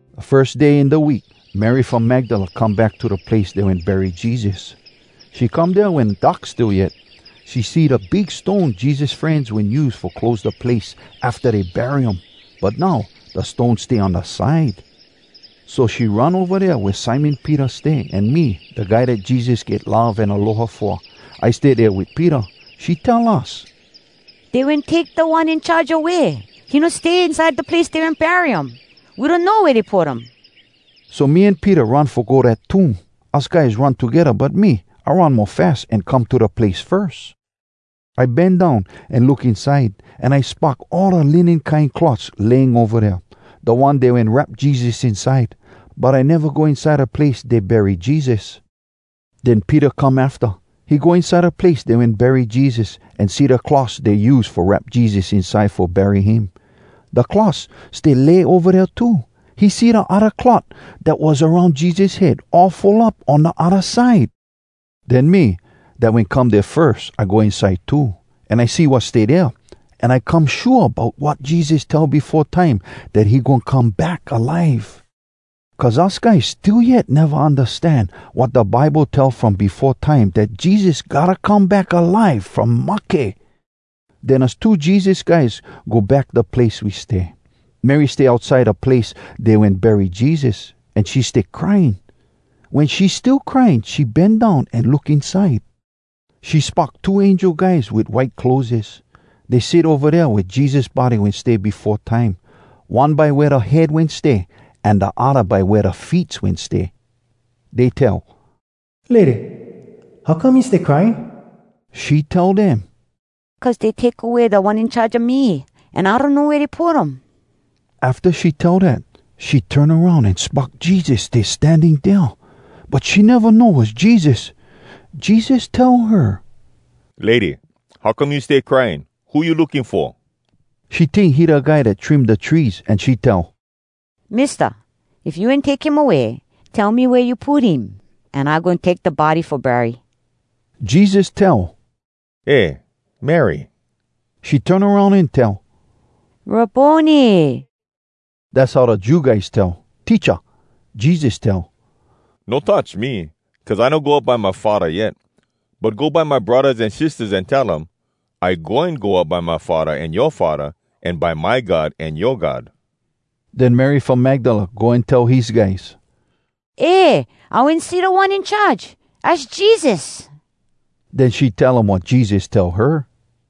Da firs day in da week, Mary from Magdala come back to da place dey wen bury Jesus. She come dea wen dark still yet. She see da big stone Jesus frenz wen use fo close da place afta dey bury um. But now, da stone stay on da side. So she run ova dea wea Simon Peter stay, an me, da guy dat Jesus get love an aloha fo, I stay dea wit Peter. She tell us, “Dey wen take Da One In Charge away! He no stay inside da place dey wen bury um! We donno wea dey put um!” So me an Peter run fo go dat tomb. Us guys run togedda, but me, I run mo fas an come to da place firs. I bend down, an look inside, an I spock all da linen kine cloths laying ova dea, da ones dey wen wrap Jesus inside. But I neva go inside da place dey bury Jesus. Den Peter come afta. He go inside da place dey wen bury Jesus, an see da cloths dey use fo wrap Jesus inside fo bury him. Da cloths stay lay ova dea too. He see da odda cloth dat was aroun Jesus head, all fold up on da odda side. Den me, dat wen come dea firs, I go inside too. An I see wat stay dea, an I come shua bout wat Jesus tell befo time, dat he goin come back alive. Cuz us guys still yet neva undastan wat da Bible tell from befo time dat Jesus gotta come back alive from mahke. Den us two Jesus guys go back da place we stay. Mary stay outside da place dey wen bury Jesus, an she stay crying. Wen she still crying, she bend down, an look inside. She spock two angel guys wit white clotheses. Dey sit ova dea wea Jesus body wen stay befo time, one by wea da head wen stay, an da odda by wea da feets wen stay. Dey tell, “Lady, how come you stay crying?” She tell dem, “Cuz dey take away Da One In Charge a me, an I donno wea dey put um.” Afta she tell dat, she turn aroun an spock Jesus stay standing dea. But she neva know was Jesus. Jesus tell her, “Lady, how come you stay crying? Who you looking fo?” She tink he da guy dat take kea da trees an she tell, “Mista, if you wen take him away, tell me wea you put him, an I goin take da body fo bury.” Jesus tell, “Eh, Mary!” She turn aroun an tell, “Rabboni!” Dass how da Jew guys tell, “Teacha!” Jesus tell, “No touch me, cuz I no go up by my Faddah yet. But go by my braddahs an sistahs an tell um, I goin go up dea by my Faddah an yoa Faddah, an by my God an yoa God.” Den Mary from Magdala go an tell his guys, “Eh! I wen see Da One In Charge, az Jesus!” Den she tell um wat Jesus tell her.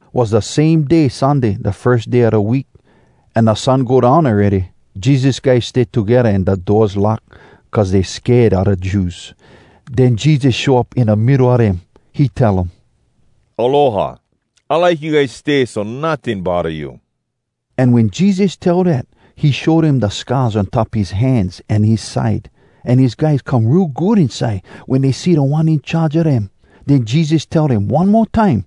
Was da same day Sunday, da firs day a da week, an da sun go down awready. Jesus guys stay togedda an da doors lock, cuz dey sked a da Jews. Den Jesus show up in da middo a dem. He tell um, “Aloha! I like you guys stay so notting bodda you!” An wen Jesus tell dat, he show dem da scars on top his hands an his side. An his guys come real good inside wen dey see Da One In Charge a dem. Den Jesus tell dem one mo time,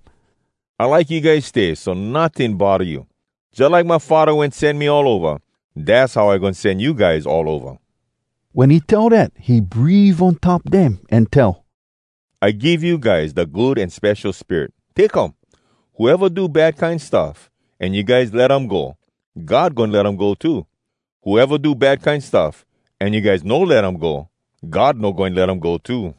“I like you guys stay so notting bodda you. Jalike my Faddah wen sen me all ova, dass how I goin sen you guys all ova.” Wen he tell dat, he breave on top dem, an tell, “I give you guys da Good An Spesho Spirit. Take um. Whoeva do bad kine stuff, an you guys let um go, God goin let um go too. Whoeva do bad kine stuff, an you guys no let um go, God no goin let um go too.”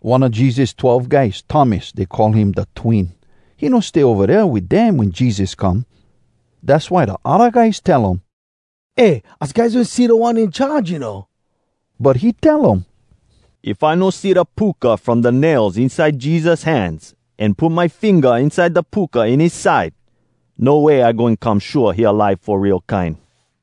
One a Jesus twelve guys, Thomas, dey call him “Da Twin.” He no stay ova dea wit dem wen Jesus come. Dass why da odda guys tell um, “Eh, us guys wen see Da One In Charge, you know.” But he tell um, “If I no see da puka from da nails inside Jesus hands, an put my finga inside da puka in his side, no way I goin come shua he alive fo real kine!”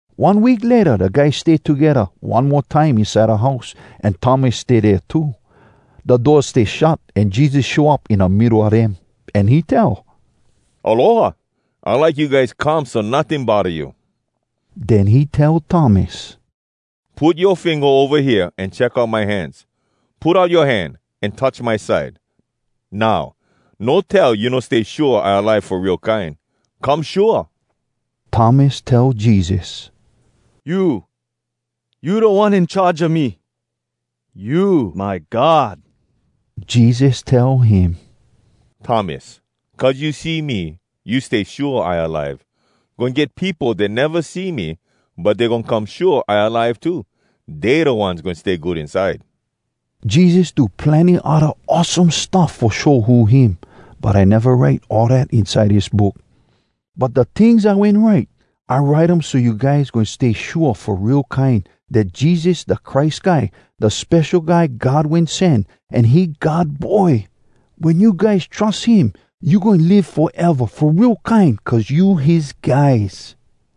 One week layta da guys stay togedda one mo time inside da house, an Thomas stay dea too. Da doors stay shut, an Jesus show up in da middo a dem. An he tell, “Aloha! I like you guys come so notting bodda you.” Den he tell Thomas, “Put yoa finga ova hea an check out my hands. Put out yoa hand, an touch my side. Now, no tell you no stay shua I alive fo real kine. Come shua!” Thomas tell Jesus, “You, you Da One In Charge a me! You my God!” Jesus tell him, “Thomas, cuz you see me, you stay shua I alive. Goin get peopo dat neva see me, but dey goin come shua I alive too. Dey da ones goin stay good inside.” Jesus do plenny odda awesome stuff fo show who him, but I neva write all dat inside dis book. But da tings I wen write, I write um so you guys goin stay shua fo real kine dat Jesus da Christ Guy, da Spesho Guy God Wen Sen, an he God Boy. Wen you guys trus him, you goin live foeva fo real kine cuz you his guys.